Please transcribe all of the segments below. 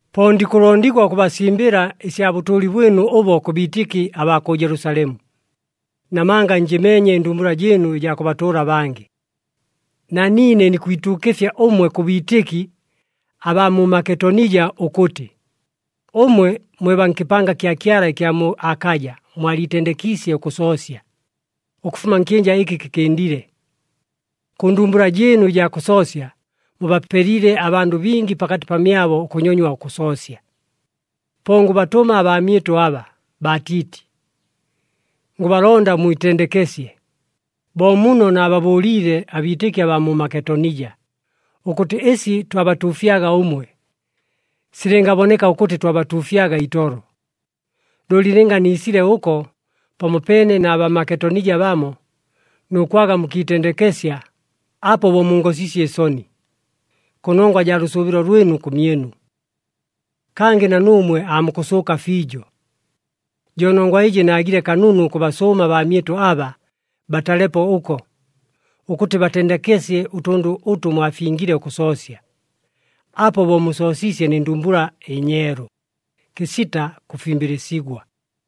Po ndikʉlondigwa ʉkʉbasimbɨla ɨsya bʉtʉʉli bwɨnu ʉbo kʉ biitɨki abaa kʉ Jelusalemu. Namanga njɨmeenye ɨndumbula jɨɨnu ɨjaa kʉbatʉʉla abangɨ. Na niine nikwituukɨfya ʉmwe kʉ biitɨki abaa mu Maketonija ʉkʉtɨ, ʉmwe mwe baa nkɨpanga kya Kyala ɨkya mu Akaja mwaliitendekiisye ʉkʉsoosya, ʉkʉfuma nkyɨnja ɨkɨ kɨkɨndile. Kʉ ndumbula jɨɨnu ɨjaa kʉsoosya, mubapelile abandʉ bingi pakatɨ pamyabo ʉkʉnyonywa ʉkʉsoosya. Po ngʉbatʉma abaamyɨtʉ aba, baa Tiiti. Ngʉbalonda mwitendekesye, bo muno naababʉʉliile abiitɨki abaa mu Maketonija, ʉkʉtɨ ɨsi twabatuufyaga ʉmwe, silɨngaboneka ʉkʉtɨ twabatuufyaga itolo. Looli lɨnga niisile ʉko pamopeene na Bamaketonija bamo, nʉ kwaga mukiitendekesya, apo bo mungosiisye ɨsoni, kʉnongwa jaa lʉsʉʉbɨlo lwɨtʉ kʉmyɨnu. Kangɨ na nuumwe aamukʉsʉʉka fiijo. Jo nongwa ɨjɨ naagile kanunu ʉkʉbasʉʉma abaamyɨtʉ aba, batalepo ʉko, ʉkʉtɨ batendekesye ʉtʉndʉ ʉtʉ mwafingile ʉkʉsoosya. Apo bo musoosiisye nɨ ndumbula ɨnyeelu, kɨsita kʉfimbɨlɨsigwa.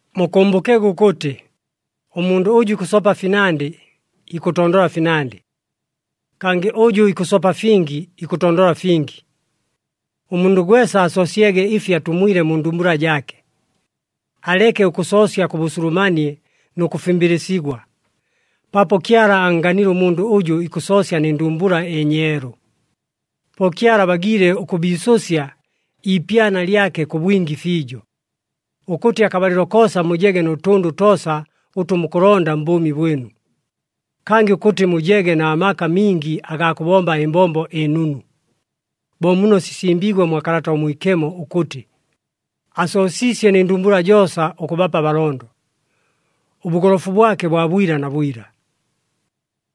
Mukʉmbʉkege ʉkʉtɨ, “Ʉmundʉ ʉjʉ ikʉsopa finandɨ, ikʉtondola finandɨ, kangɨ ʉjʉ ikʉsopa fingi, ikʉtondola fingi.” Ʉmundʉ gwesa asoosyege ɨfi atumwile mu ndumbula jaake. Aleke ʉkʉsoosya kʉ bʉsulumanie nʉ kʉfimbɨlɨsigwa, paapo Kyala annganile ʉmundʉ ʉjʉ ikʉsoosya nɨ ndumbula ɨnyeelu. Po Kyala abagiile ʉkʉbiisʉsya iipyana lyake kʉ bwingi fiijo, ʉkʉtɨ akabalɨlo koosa mujege nʉ tʉndʉ toosa ʉtʉ mukʉlonda mbʉʉmi bwɨnu, kangɨ ʉkʉtɨ mujege na maka mingi agaa kʉbomba ɨmbombo ɨnunu. Bo muno sisimbiigwe mwa Kalata ʉMwikemo ʉkʉtɨ, “Asoosiisye nɨ ndumbula joosa, ʉkʉbapa abalondo, ʉbʉgolofu bwake bwa bwila na bwila.”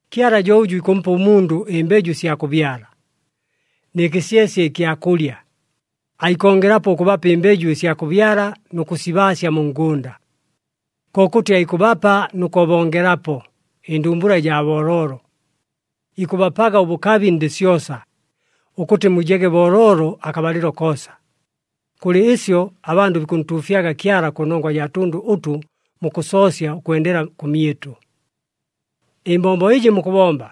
Kyala jo ʉjʉ ikʉmpa ʉmundʉ ɨmbeju ɨsya kʉbyala, nɨ kɨsyesye ɨkya kʉlya, aikongelapo ʉkʉbapa ɨmbeju ɨsya kʉbyala nʉ kʉsibaasya mu ngʉnda. Kokʉtɨ aikʉbapa nʉ kʉbongelapo ɨndumbula ɨjaa booloolo. Ikʉbapaga ʉbʉkabi ndɨ syosa, ʉkʉtɨ mujege booloolo akabalɨlo koosa. Kʉlɨ ɨsyo abandʉ bikʉntuufyaga Kyala kʉnongwa jaa tʉndʉ ʉtʉ mukʉsoosya ʉkwendela kʉmyɨtʉ. Ɨmbombo ɨjɨ mukʉbomba,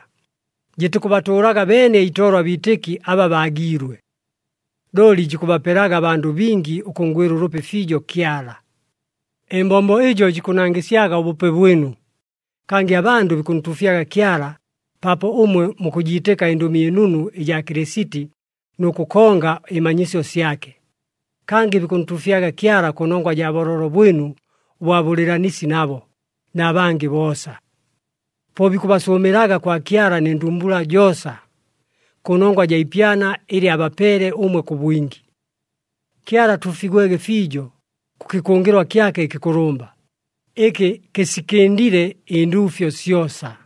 jɨtikʉbatʉʉlaga beene itolo abiitɨki aba baagiilwe, looli jikʉbapelaga abandʉ bingi ʉkʉnngwɨla ʉlʉpi fiijo Kyala. Ɨmbombo ɨjo jikʉnangɨsyaga ʉbʉpe bwɨnu, kangɨ abandʉ bikʉntuufyaga Kyala paapo ʉmwe mukʉjiitɨka ɨNdʉmi ɨNunu ɨjaa Kɨlɨsiti nʉ kʉkonga ɨmanyisyo syake. Kangɨ bikʉntuufyaga Kyala kʉnongwa jaa booloolo bwɨnu ʉbwa bʉlɨɨlanisi nabo, na bangɨ boosa. Po bikʉbasʉʉmɨlaga kwa Kyala nɨ ndumbula joosa, kʉnongwa jaa ipyana ɨlɨ abapeele ʉmwe kʉ bwingi. Kyala atuufigwege fiijo kʉ kɨkʉngɨlwa kyake ɨkɨkʉlʉmba, ɨkɨ kɨsikɨndile ɨnduufyo syosa!